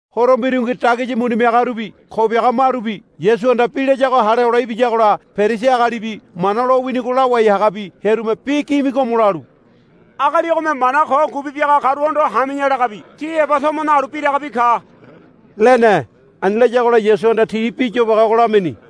Horo mbirungi dagisi muni miagarubi ko biaga marubi Yasuhanda bi layago hale hole ibiyagola Perisi agalibi Mana lowinigo lawai hagabi hearume bi gimigomo lalu, Agali ogome mana ko ngubi biaga karuhondo, Hami̱ya, lagabi ti heba tomo nalu biragabi ka, lene. Ani layagola Yasuhanda ti bi yobage ogo lamini.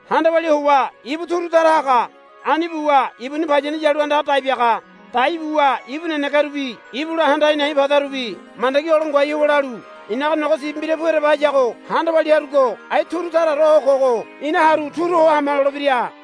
Handa walia howa ibu turu tara haga. Ani buwa ibuni payani yalu andaga dai biaga. Dai buwa ibu nenegerubi ibula handa a̱i̱ na̱i̱ padarubi mandagi olo ngoai howa lalu, I̱naga nogo sibi mbira pu ereba hayago handa walia harugo ai turu taraore ho kogo ina haru turu ho hama, lolebira.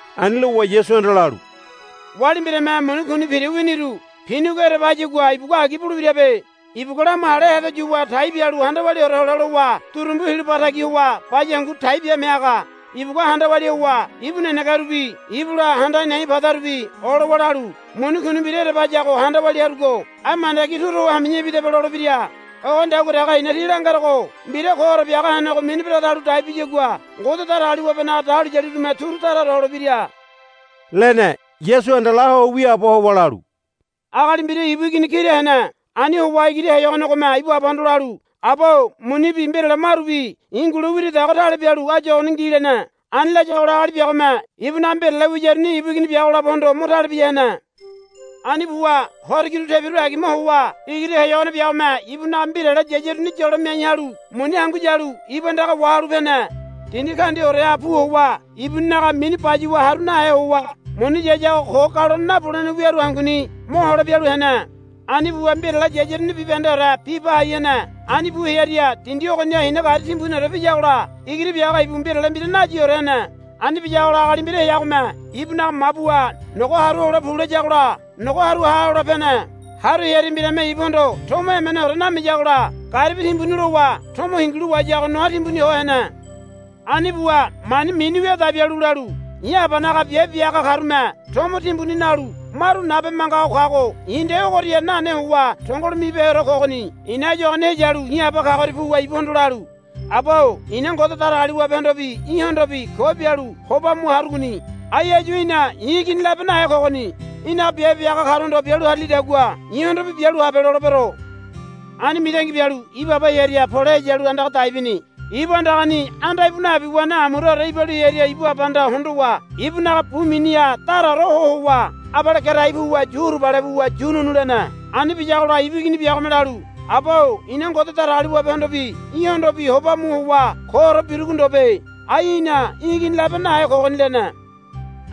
Ani lowa Yasuhanda lalu, Wali mbirame muni kuni pira winiru pinigo ereba hayagua ibugua agi bulebirabe. Ibugua lamu hale hedo yuwa tai bialu handa waliaore hole lowa durumbu hilo ba tagi howa baya hangu tai biame haga. Ibugua handa walia howa ibu nenegerubi ibula handa a̱i̱ na̱i̱ padarubi olowa lalu, Muni kuni mbira ereba hayago handa walia harugo ai mandagi turu ho hami̱ya ibidaba, lolebira. Ogonidagua dege i̱na tí langerogo mbira koore biaga henego mini beregedalu dai biyagua Ngode Datagaliwabenaga dahuliyalirume turu taraore holebira, lene. Yasuhanda la ho wiaabo howa lalu, Agali mbira ibu igini kira hene. Ani howa igiri heyogonegome ibu abahondo lalu, Aba-o munibi mbirale marubi i̱ ngule wiridago tale bialu áyu ogoni ngi, lene. Ani layagola agali biagome ibunaga mbirale wiyaruni ibu igini biago labohondo mo tale bia hene. Ani buwa horo kiru tebiru agima howa igiri heyogone biagome ibunaga mbirale yayaruni yolo miai halu muni hangu yalu ibu andaga wahalu pene. Dindi kaundiaoreha pu howa ibuninaga mini bayuwa haru nahe howa muni yayago ko galone nabulene wiaru hanguni mohole bialu hene. Ani buwa mbirale yayaruni bibahendeore biba hai hene. Ani bu hearia dindi ogoniha hina gari timbuniore piyagola igiri biago ibu mbirale mbira nayiore hene. Ani biyagola agali mbira heagome ibunaga mabuha, Nogo haru hole pu, layagola nogo haru ha hole pene. Haru hearia mbirame ibuhondo tomo emeneore namiyagola garibi timbuni lowa tomo hingilu wahayago noa timbuni ho hene. Ani buwa mani mini wia dai bialu lalu, I̱ abanaga biabe bia haga karume tomo timbuni nalu maru nabe manga ho kago i̱ nde ogoria nane howa tongolo mibeheore kogoni. I̱na áyu ogoni heyalu i̱ aba kagoria puwa ibuhondo lalu, Aba-o i̱na Ngode Datagaliwabehondobi í̠hondobi ko bialu hoba mu harugoni. Ai áyu i̱na í̠ igini labe nahe kogoni. Í̠naga biabe bia haga karuhondo bialu harilidagua i̱hondobi bialu habe lolebero. Ani mitangi bialu ibu aba hearia pole heyalu andaga dai bini. Ibu andagani anda íbu nabi wene amuraore ibalu hearia ibu abahanda hondowa ibunaga bu miniha daraore ho howa abale gerai puwa yu hurubale buwa yu nu̱nu̱ lene. Ani biyagola ibu igini biagome lalu, Aba-o i̱na Ngode Datagaliwabehondobi í̠hondobi hoba mu howa koore birugo ndobe. Ai i̱na í̠ igini labe nahe kogoni, lene.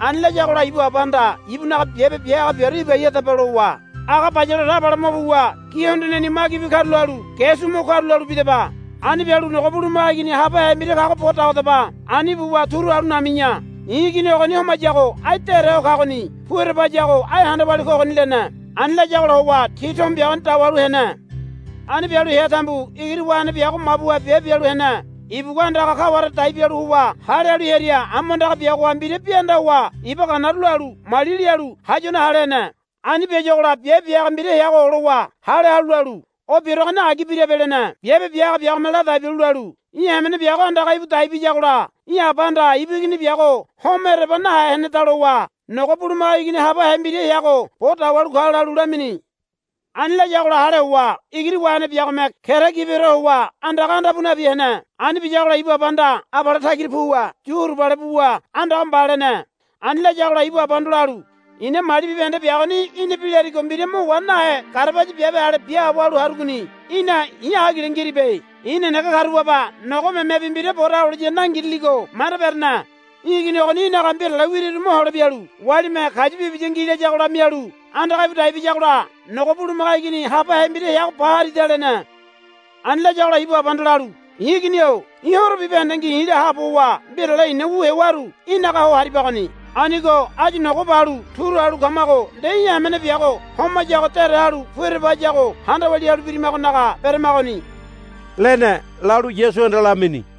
Ani layagola ibu abahanda ibunaga biabe bia haga biaru, Ibai hadaba, lowa, Aga bayaleore abale mo puwa gi hondoneni magibi karula halu ge su mo karula halu bidaba. Ani bialu nogo bulumaga igini habahe mbira kago bo puwa dawadaba. Ani buwa turu halu nami̱ya. I̱ igini ogoni homayago ai dére ho kagoni. Pu ereba hayago ai handa walia kogoni, lene. Ani layagola howa ti tomo biagoni dawalu hene. Ani bialu hea tambu igiri wahene biago mabuha biabe bialu hene. Ibugua andaga kaware dai bialu howa hale halu hearia amu andaga biagoha mbira bi anda howa iba ganaru lalu mali lialu hayuane hale hene. Ani biayuagola biabe bia haga mbira heago olowa hale halu lalu, O biaruagoni agi birabe, lene. Biabe bia haga biagome ladai bialu lalu, Í̠ hamene biago andaga íbu dai biyagola í̠ abahanda ibu igini biago homo ereba nahe heneda lowa nogo bulumaga igini habahe mbira heago bo dawalu ka, lalu lamini. Ani layagola hale howa igiri wahene biagome kera gibiore howa andaga anda pu nabi hene. Ani biyagola ibu abahanda abale tagira puwa yu hurubale buwa, Andaga mba, lene. Ani layagola ibu abahondo lalu, I̱na mali bibahende biagoni í̠na bi larigo mbira mo wa nahe garabaya biabe ale biaabo halu harugoni. Í̠na i̱ agile ngiribe. I̱ nenege karu baba nogo memebi mbira bo dawaliya nangiriligo manda berene. Í̠ igini ogoni í̠naga mbirale wiriru mohole bialu walime kayu bibiya ngi layagola mialu andaga íbu dai biyagola nogo bulumaga igini habahe mbira heago ba harida, lene. Ani layagola ibu abahanda lalu, I̱ igini-o í̠ horo bibahendengi i̱la haabo howa mbirale i̱na wu hewaru í̠naga ho haribagoni. Anigo áyu nogo balu uru halu kamago nde í̠ hamene biago homayago dére halu pu ereba hayago handa walia halu birimagonaga beramagoni, lene, lalu Yasuhanda lamini.